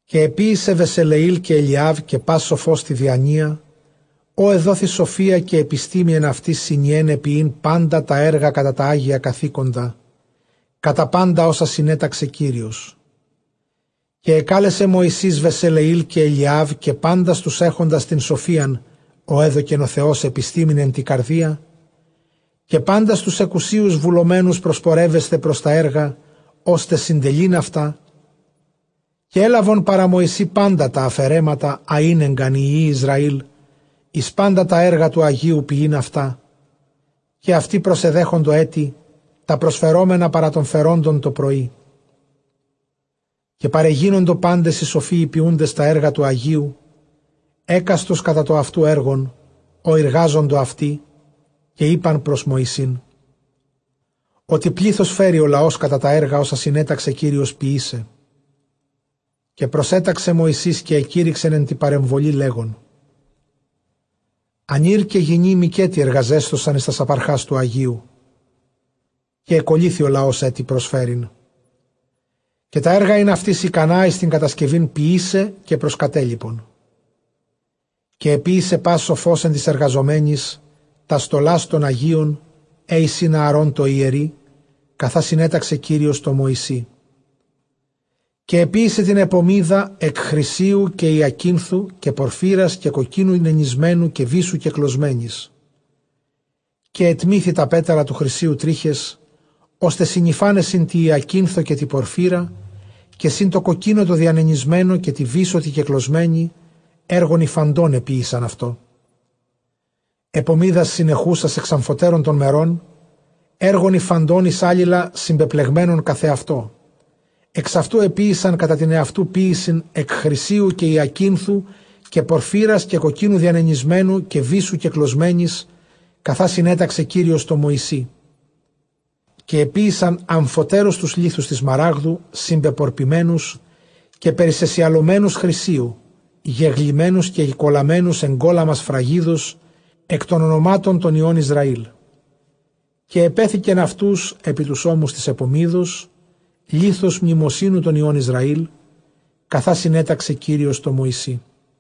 Καὶ ἐποίησε Βεσελεὴλ καὶ Ἐλιὰβ, καὶ πᾶς σοφὸς τῇ διανοὶᾳ, ᾧ ἐδόθη σοφία καὶ ἐπιστήμη ἐν αὑτοῖς, συνιέναι ποιεῖν πάντα τὰ ἔργα, κατὰ τὰ ἅγια καθήκοντα, κατὰ πάντα ὅσα συνέταξε Κύριος. Καὶ ἐκάλεσε Μωυσῆς Βεσελεὴλ καὶ Ἐλιὰβ, καὶ πάντας τοὺς ἔχοντας τὴν σοφίαν, ᾧ ἔδωκεν ὁ Θεὸς ἐπιστήμην ἐν τῇ καρδίᾳ, καὶ πάντας τοὺς ἑκουσίως βουλομένους προσπορεύεσθαι πρὸς τὰ ἔργα, ὥστε συντελεῖν αὐτά. Καὶ ἔλαβον παρὰ Μωσῆ πάντα τὰ ἀφαιρέματα, ἃ ἤνεγκαν οἱ υἱοὶ Ἰσραὴλ εἰς πάντα τὰ ἔργα τοῦ ἁγίου ποιεῖν αὐτά· καὶ αὐτοὶ προσεδέχοντο ἔτι τὰ προσφερόμενα παρὰ τῶν φερόντων τὸ πρωΐ. Καὶ παρεγίνοντο πάντες οἱ σοφοὶ οἱ ποιοῦντες τὰ ἔργα τοῦ ἁγίου, ἕκαστος κατὰ τὸ αὐτοῦ ἔργον, ὃ εἰργάζοντο αὐτοί. Καὶ εἶπε πρὸς Μωυσῆν, ὅτι πλῆθος φέρει ὁ λαὸς κατὰ τὰ ἔργα ὅσα συνέταξε Κύριος ποιῆσαι. Καὶ προσέταξε Μωυσῆς, καὶ ἐκήρυξεν ἐν τῇ παρεμβολῇ, λέγων, ἀνὴρ καὶ γυνὴ μηκέτι ἐργαζέσθωσαν εἰς τάς ἀπαρχὰς τοῦ ἁγίου· καὶ ἐκωλύθη ὁ λαὸς ἔτι προσφέρειν. Καὶ τὰ ἔργα ἦν αὐτοῖς ἱκανὰ εἰς τὴν κατασκευὴν ποιῆσαι, καὶ προσκατέλιπον. Καὶ ἐποίησε πᾶς σοφὸς ἐν τοῖς ἐργαζομένοις τὰς στολὰς τῶν ἁγίων, αἵ εἰσιν Ἀαρὼν τῷ ἱερεῖ, καθὰ συνέταξε Κύριος τῷ Μωυσῇ. Καὶ ἐποίησε τὴν ἐπωμίδα ἐκ χρυσίου, καὶ ὑακίνθου, καὶ πορφύρας, καὶ κοκκίνου νενησμένου, καὶ βύσσου κεκλωσμένης· καὶ ἐτμήθη τὰ πέταλα τοῦ χρυσίου τρίχες, ὥστε συνυφάναι σὺν τῇ ὑακίνθῳ, καὶ τῇ πορφύρᾳ, καὶ σὺν τῷ κοκκίνῳ τῷ διανενησμένῳ, καὶ τῇ βύσσῳ τῇ κεκλωσμένῃ· ἔργον ὑφαντὸν ἐποίησαν αὐτό· ἐπωμίδας συνεχούσας ἐξ ἀμφοτέρων τῶν μερῶν, ἔργον ὑφαντὸν εἰς ἄλληλα συμπεπλεγμένα καθʼ ἑαυτό. Ἐξ αὐτοῦ ἐποίησαν αὐτὸ κατὰ τὴν αὐτοῦ ποίησιν, ἐκ χρυσίου, καὶ ὑακίνθου, καὶ πορφύρας, καὶ κοκκίνου διανενησμένου, καὶ βύσσου κεκλωσμένης, καθὰ συνέταξε Κύριος τῷ Μωυσῇ· καὶ ἐποίησαν ἀμφοτέρους τοὺς λίθους τῆς σμαράγδου συνπεπορπημένους καὶ περισεσιαλωμένους χρυσίῳ, γεγλυμμένους καὶ ἐκκεκολαμμένους ἐγκόλαμμα σφραγίδος ἐκ τῶν ὀνομάτων τῶν υἱῶν Ἰσραήλ· καὶ ἐπέθηκεν αὐτοὺς ἐπὶ τοὺς ὤμους τῆς ἐπωμίδος, λίθους μνημοσύνου τῶν υἱῶν Ἰσραὴλ, καθὰ συνέταξε Κύριος τῷ Μωυσῇ.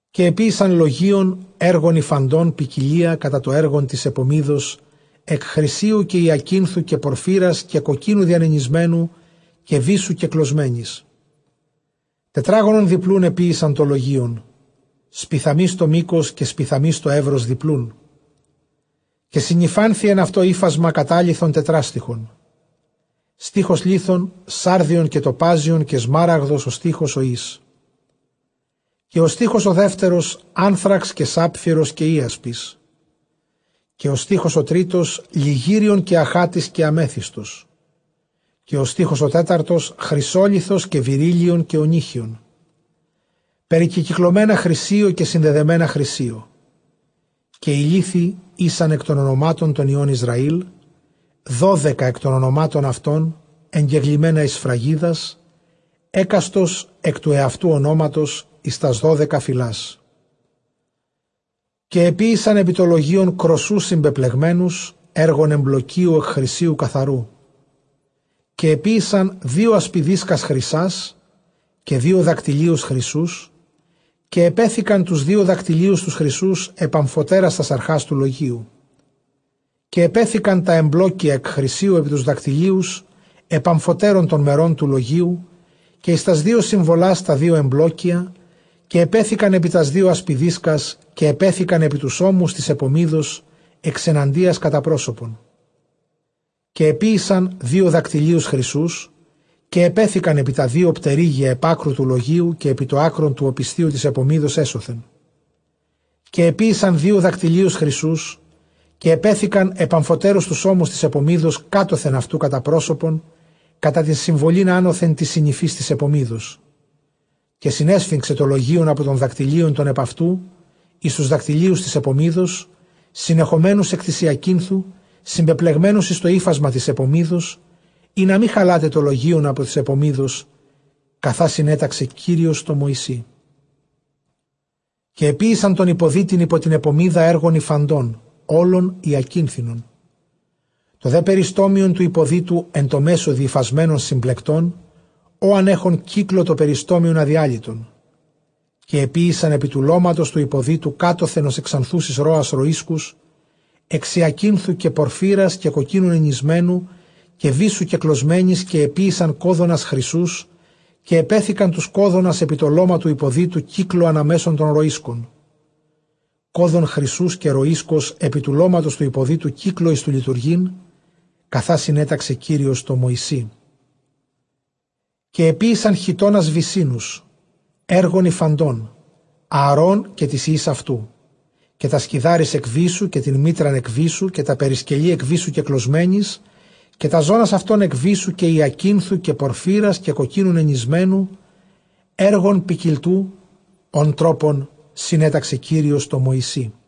Καὶ ἐποίησαν λογεῖον, ἔργον ὑφαντὸν ποικιλίᾳ κατὰ τὸ ἔργον τῆς ἐπωμίδος, ἐκ χρυσίου, καὶ ὑακίνθου, καὶ πορφύρας, καὶ κοκκίνου διανενησμένου, καὶ βύσσου κεκλωσμένης· τετράγωνον διπλοῦν ἐπόησαν τὸ λογεῖον· σπιθαμῆς τὸ μῆκος, καὶ σπιθαμῆς τὸ εὖρος διπλοῦν. Καὶ συνυφάνθη ἐν αὐτῷ ὕφασμα κατάλιθον τετράστιχον· στίχος λίθων, σάρδιον καὶ τοπάζιον καὶ σμάραγδος, ὁ στίχος ὁ εἷς· καὶ ὁ στίχος ὁ δεύτερος, ἄνθραξ καὶ σάπφειρος καὶ ἴασπις· καὶ ὁ στίχος ὁ τρίτος, λιγύριον καὶ ἀχάτης καὶ ἀμέθυστος· καὶ ὁ στίχος ὁ τέταρτος, χρυσόλιθος καὶ βηρύλλιον καὶ ὀνύχιον περικεκυκλωμένα χρυσίῳ, καὶ συνδεδεμένα χρυσίῳ. Καὶ οἱ λίθοι ἦσαν ἐκ τῶν ὀνομάτων τῶν υἱῶν Ἰσραὴλ δώδεκα, ἐκ τῶν ὀνομάτων αὐτῶν ἐγγεγλυμμένα εἰς σφραγίδας, ἕκαστος ἐκ τοῦ ἑαυτοῦ ὀνόματος εἰς τὰς δώδεκα φυλάς. Καὶ ἐποίησαν ἐπὶ τὸ λογεῖον κρωσσοὺς συμπεπλεγμένους, ἔργον ἐμπλοκίου, ἐκ χρυσίου καθαροῦ. Καὶ ἐποίησαν δύο ἀσπιδίσκας χρυσᾶς, καὶ δύο δακτυλίους χρυσοῦς· καὶ ἐπέθηκαν τοὺς δύο δακτυλίους τοὺς χρυσοῦς ἐπʼ ἀμφοτέρας τὰς ἀρχὰς τοῦ λογείου. Καὶ ἐπέθηκαν τὰ ἐμπλόκια ἐκ χρυσίου ἐπὶ τοὺς δακτυλίους ἐπʼ ἀμφοτέρων τῶν μερῶν τοῦ λογείου· καὶ εἰς τὰς δύο συμβολὰς τὰ δύο ἐμπλόκια. Καὶ ἐπέθηκαν ἐπὶ τὰς δύο ἀσπιδίσκας· καὶ ἐπέθηκαν ἐπὶ τοὺς ὤμους τῆς ἐπωμίδος ἐξεναντίας κατὰ πρόσωπον. Καὶ ἐποίησαν δύο δακτυλίους χρυσοῦς, καὶ ἐπέθηκαν ἐπὶ τὰ δύο πτερύγια ἐπʼ ἄκρου τοῦ λογείου, καὶ ἐπὶ τὸ ἄκρον τοῦ ὀπισθίου τῆς ἐπωμίδος ἔσωθεν· Καὶ ἐποίησαν δύο δακτυλίους χρυσοῦς, καὶ ἐπέθηκαν ἐπʼ ἀμφοτέρους τοὺς ὤμους τῆς ἐπωμίδος κάτωθεν αὐτοῦ, κατὰ πρόσωπον κατὰ τὴν συμβολὴν ἄνωθεν τῆς συνυφῆς τῆς ἐπωμίδος· καὶ συνέσφιγξε τὸ λογεῖον ἀπὸ τῶν δακτυλίων τῶν ἐπʼ αὐτοῦ εἰς τοὺς δακτυλίους τῆς ἐπωμίδος, συνεχομένους ἐκ τῆς ὑακίνθου, συμπεπλεγμένους εἰς τὸ ὕφασμα τῆς ἐπωμίδος, ἵνα μὴ χαλᾶται τὸ λογεῖον ἀπὸ τῆς ἐπωμίδος, καθὰ συνέταξε Κύριος τῷ Μωυσῇ. Καὶ ἐποίησαν τὸν ὑποδύτην ὑπὸ τὴν ἐπωμίδα, ἔργον ὑφαντὸν, ὅλον ὑακίνθινον· τὸ δὲ περιστόμιον τοῦ ὑποδύτου ἐν τῷ μέσῳ διυφασμένον συμπλεκτὸν, ὤαν ἔχον κύκλῳ τὸ περιστόμιονν ἀδιάλυτον· Καὶ ἐποίησαν ἐπὶ τοῦ λώματος τοῦ ὑποδύτου κάτωθεν ὡς ἐξανθούσης ῥόας ῥοΐσκους, ἐξ ὑακίνθου, καὶ πορφύρας, καὶ κοκκίνου νενησμένου, καὶ βύσσου κεκλωσμένης. Καὶ ἐποίησαν κώδωνας χρυσοῦς, καὶ ἐπέθηκαν τοὺς κώδωνας ἐπὶ τὸ λῶμα τοῦ ὑποδύτου κύκλῳ ἀνὰ μέσον τῶν ῥοΐσκων· κώδων χρυσοῦς καὶ ῥοΐσκος ἐπὶ τοῦ λώματος τοῦ ὑποδύτου κύκλῳ, εἰς τὸ λειτουργεῖν, καθὰ συνέταξε Κύριος τῷ Μωυσῇ. Καὶ ἐποίησαν χιτῶνας βυσσίνους, ἔργον ὑφαντὸν, Ἀαρὼν καὶ τοῖς υἱοῖς αὐτοῦ, καὶ τὰς κιδάρεις ἐκ βύσσου, καὶ τὴν μίτραν ἐκ βύσσου, καὶ τὰ περισκελῆ ἐκ βύσσου κεκλωσμένης, καὶ τὰς ζώνας αὐτῶν ἐκ βύσσου, καὶ ὑακίνθου, καὶ πορφύρας, καὶ κοκκίνου νενησμένου, ἔργον ποικιλτοῦ, ὃν τρόπον συνέταξε Κύριος τῷ Μωυσῇ.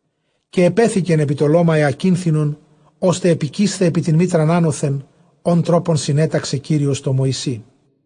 Καὶ ἐπέθηκαν ἐπὶ τὸ λῶμα ὑακίνθινον, ὥστε ἐπικεῖσθαι ἐπὶ τὴν μίτραν ἄνωθεν, ὅν τρόπον συνέταξε Κύριος τῷ Μωυσῇ.